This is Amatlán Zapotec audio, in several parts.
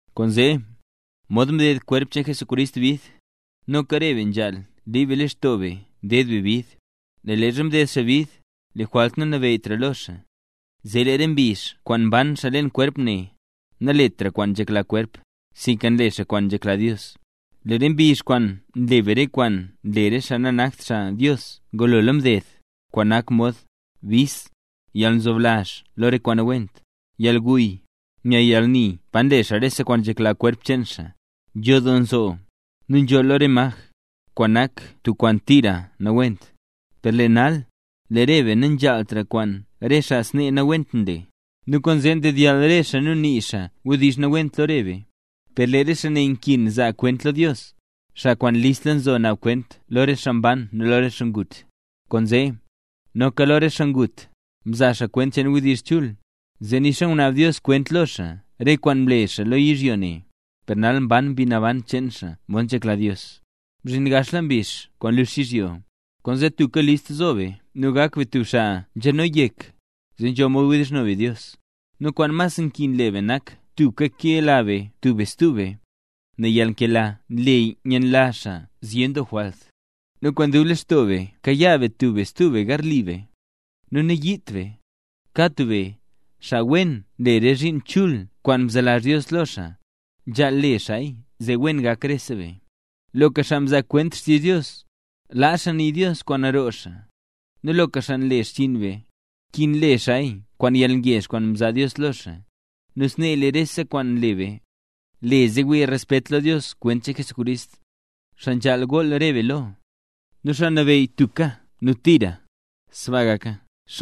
Kwaanzee, mod mded kwerp cheen Jesucrist bid, noka re be nzhaal liib be lextoo be ded be bid; nel leezha mded xaa bid, lee jwalt nanabeyytra lo xaa, zee lee re mbizh kwaan mban xaa leen kwerp ne, naletra xaa kwaan nzhekla kwerp, sinka nle xaa kwaan nzhekla Dios. Lee re mbizh kwaan nle be re kwaan nle re xaa nanakt xaa Dios ngulola mded, kwaan nak mod: bis, yalnzoblazh lo re kwaan nawent, yalguy, nya yalni pa nle rese kwaan nzhekla kwerp cheen xaa, nzho doo nzoo, nu nzholl lo re maj, kwaan nak tub kwaan tira nawent. Per lee nal, lee re be nanzhaaltra kwaan re xaa snee nawent nle, nu kwaanzee ndedyall re xaa nu nii xaa wdizh nawent lo re be. Per lee re xaa ne nkin zaa kwent lo Dios, xaa kwaan listla nzo naab kwent lo re xaa mban nu lo re xaa ngut. Kwaanzee, noka lo re xaa ngut, mzaa xaa kwent cheen wdizh chul, zee nixa ngunaab Dios kwent lo xaa re kwaan mle xaa lo yizhyo ne, per nal ban mbi naban cheen xaa mod nzhekla Dios. Mzhin gaxla mbizh kwaan lux yizhyo; kwaanzee, tubka list zo be nu gak be tub xaa nzhano yek, zee nzho mod wdizhno be Dios. Nu kwaan mas nkin le be nak tubka kela be tub be stub be, nel lee yalnkela nle nyenlazh xaa zyen doo jwalt. Nu kwaan dub lextoo be kayaa be tub be stub be garli be, nu nayiit be. Kad tub be, xaa wen nle re zhiin chul kwaan mzelazh Dios lo xaa, nzhaal le xaaya zee wen gak rese be. Loka xaa nzaa kwent xtizh Dios, laa xaa nii Dios kwaan roo xaa; nu loka xaa nle xchiin be, nkin le xaaya kwaan yalngezh kwaan nzaa Dios lo xaa. Nu snee lee rese kwaan nle be, le zee wii re xaa respet lo Dios kwent cheen Jesucrist, xaa nzhaal gool re be lo, nu xaa nabeyy tubka nu tira. ¡Sbaa gaka!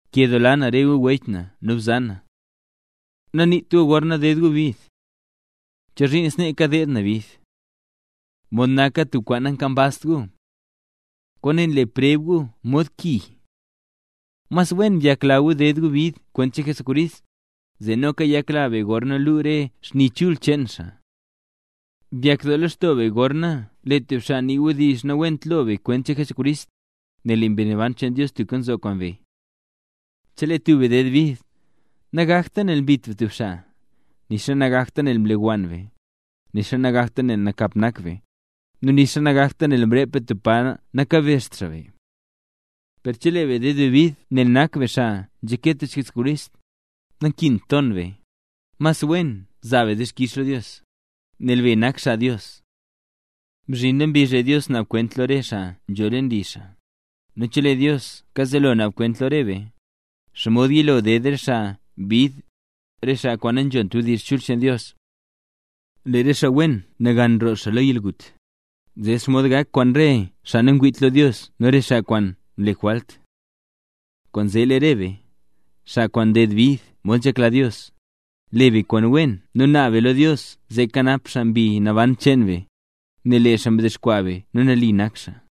Nkedoola na re gu wech nu bzan. Naniit gu gorna ded gu bid: “¿Chozhiin snee kadeed na bid?”, mod naka tub kwaan nankambazt gu. Kwaane le preb gu mod ki. Mas wen byakla be ded be bid kwent cheen Jesucrist, zee noka yakla be gorna luu re xni chul cheen xaa. Byakdoo lextoo be gorna lee tub xaa nii wdizh nawent lo be kwent cheen Jesucrist, nel lee Mbi Naban cheen Dios tubka nzo kwaan be. Chelee tub be ded bid, nagakta nel mbit be tub xaa, nixa nagakta nel mlewann be, nixa nagakta nel nakap nak be, nu nixa nagakta nel mrep be tub pa nakabezht xaa be. Per chelee be nded be bid nel nak be xaa nzhake tich Jesucrist, nankint ton be, mas wen zaa be dixkix lo Dios, nel be nak xaa Dios. Mzhinla mbizh lee Dios naab kwent lo re xaa nzho leen li xaa, nu chelee Dios kazelo naab kwent lo re be, ¿xomod yilo ded re xaa bid, re xaa kwaan nanzhont wdizh chul cheen Dios? Lee re xaa wen nagan roo xaa lo yalgut, ¿zee xomod gak kwaan re xaa nangwiit lo Dios nu re xaa kwaan nle jwalt? Kwaanzee lee re be, xaa kwaan nded bid mod nzhekla Dios, le be kwaan wen nu naab be lo Dios zee kanap xaa mbi naban cheen be, nel lee xaa mdexkwaa be nu nali nak xaa.